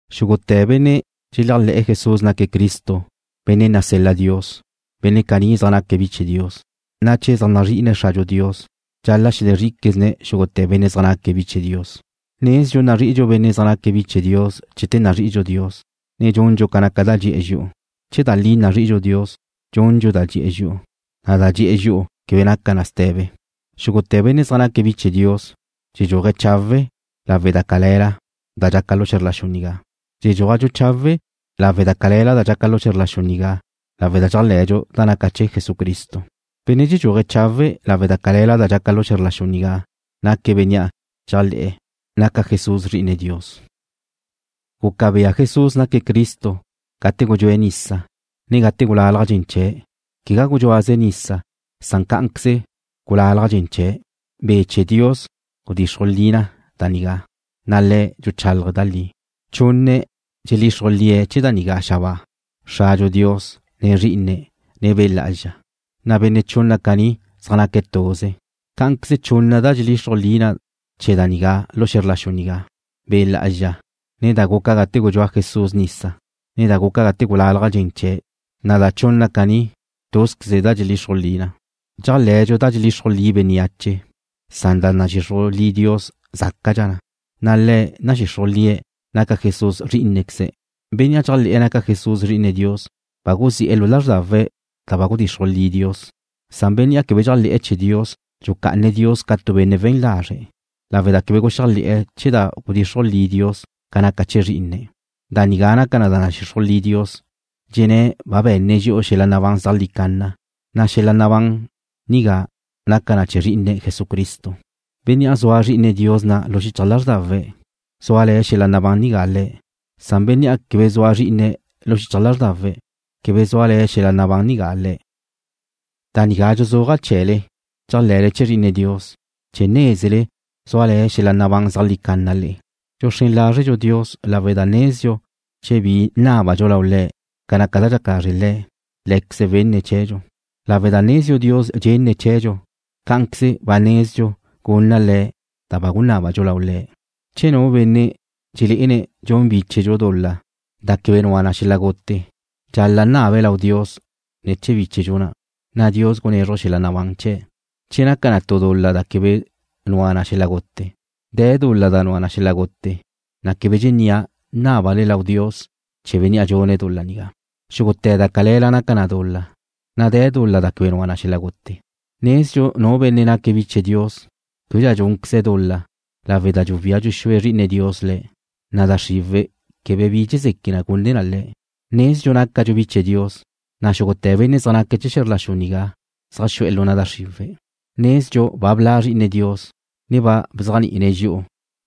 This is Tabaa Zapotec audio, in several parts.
Xúgute̱ benne' dxeléajle̱'e̱ Jesús naque̱' Cristo, Benne' nasel-la Dios, benne' caní zaj naque̱' bi chee̱ Dios, na' che zaj nazri'ine̱' Xradxu Dios, dxal-la' xelezrí'iquezne̱' xúgute̱ benne' zaj naque̱' bi chee̱ Dios. Nezdxu nazri'idxu benne' zaj naque̱' bi chee̱ Dios chete nazri'idxu Dios, ne dxundxu ca naca da dxi'e̱ dxi'u. Che da li nazri'idxu Dios, dxundxu da dxi'e̱ dxi'u. Da dxi'e̱ dxi'u quebe naca na ste̱be. Xúgute̱ benne' zaj naque̱' bi chee̱ Dios dxedxúaje̱' chawe' lau da cale̱la da dxaca na lu xe̱zr la xu nigá. Dxedxúajdxu chawe' lau da cale̱la da dxaca na lu xe̱zr la xu nigá lawe' da dxéajle̱dxu da naca na chee̱ Jesucristo. Benne' dxedxuaje' chawe' lau da cale̱la da dxaca na lu xe̱zr la xu nigá naque̱' bénnea' dxéajle̱'e̱ naca Jesús Zri'ine Dios. Guca bea Jesús naque̱' Cristo gate gudxúe̱' nisa, ne gate gulalaj dxen chee̱'. Quegá gudxúaze̱' nisa san cá'anqueze gulalaj dxen chee̱'. Be' chee̱ Dios gudxixruj lie̱' da nigá, na' Le̱' dxuchálaje̱' da li. Chunne̱' dxelixruj lie̱' chee̱ da nigá xabáa, Xradxu Dios, ne Zrí'ine̱', ne Be' Lá'azxa, na' chunne̱' caní zaj naque̱' tuze. Cá'anqueze chunna da dxelixruj li na chee̱ da nigá lu xe̱zr la xu nigá, Be' Lá'azxa, ne da guca gate gudxúa Jesús nisa, ne da guca gate gulalaj dxen chee̱', na' da chunna caní, túzqueze da dxelixruj li na. Dxéajle̱dxu da dxelixruj li bénneache, san da nadxixruj li Dios zácadxa na, na' Le̱' nadxixruj lie̱' naca Jesús Zrí'inequeze̱'. Bénnea' dxéajle̱'e̱ naca Jesús Zri'ine Dios ba guzi'e̱ xichaj lázrdawe̱' da ba gudxixruj li Dios, san bénnea' quebe dxéajle̱'e̱ chee̱ Dios dxucá'ane̱' Dios ca tu benne' we̱n lazre', lawe' da quebe guxéajle̱'e̱ chee̱ da ba gudxixruj li Dios ca naca chee̱ Zrí'ine̱'. Da nigá naca na da nadxixruj li Dios, dxenné̱' ba be̱nne̱' dxi'u xel-la' nabán zeajlí canna, na' xel-la' nabán nigá za na lu na' Zrí'ine̱', Jesucristo. Bénnea' zua Zri'ine Dios na' lu xichaj lázrdawe̱' zúale̱ xel-la nabán nigá le̱', san bénnea' quebe zua Zrí'ine̱' lu xichaj lázrdawe̱' quebe zúale̱ xel-la' nabán nigá le̱'. Da nigá dxuzúaja' chee̱le dxéajle̱le chee̱ Zri'ine Dios chee̱ nézele zúale̱ xel-la' nabán zeajlí canna le'e. Dxuxrén lázredxu Dios lawe' da nezdxu che bi nábadxu lau Le̱' ca naca da dxaca lazre' Le̱', Lé̱queze̱' wenne̱' chee̱dxu. Lawe' da nezdxu Dios dxenne̱' chee̱dxu, cá'anqueze ba nezdxu gunna Le̱' da ba gunábadxu lau Le̱'. Che tu benne' dxelé'ene̱' dxun bíchedxu dul-la da quebe nua na xel-la' gute, dxal-la' nabe̱' lau Dios ne̱ chee̱ bíchedxu na', na' Dios gunézruje̱' xel-la' nabán chee̱', che naca na tu dul-la da quebe nua na xel-la' gute. De̱ dul-la da nua na xel-la' gute, na' quebe dxennía' nábale lau Dios ne̱ chee̱ bénnea' dxune̱' dul-la nigá. Xúgute̱ da cale̱la naca na dul-la, na' de̱ dul-la da quebe nua na xel-la' gute. Nezdxu nu benne' naca bi chee̱ Dios québedxa dxúnqueze̱' dul-la lawe' da dxuwía dxuxúe Zri'ine Dios le̱', na' da xriwe̱' quebe bi dxezeque gune na le̱'. Nezdxu nácadxu bi chee̱ Dios, na' xúgute̱ benne' zaj naca chee̱ xe̱zr la xu nigá zaj xu'e̱ lu na' da xriwe̱'. Nezdxu ba bla' Zri'ine Dios, ne ba bzéajni'ine̱' dxi'u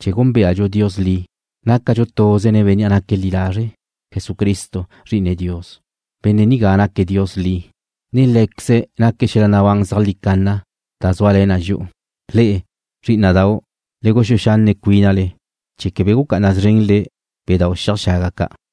chee̱ gúnbeadxu Dios li. Nácadxu tuze nen Bénnea' naque̱' li lazre', Jesucristo, Zri'ine Dios. Benne' nigá naque̱' Dios li, ne Lé̱queze̱' naque̱' xel-la' nabán zeajlí canna da zúale̱ na dxi'u. Le'e, zrí'ina'dau', le guxúe xanne' cuínale chee̱ quebe gucá'ana szrenle bedau' xiaj xaga ca'.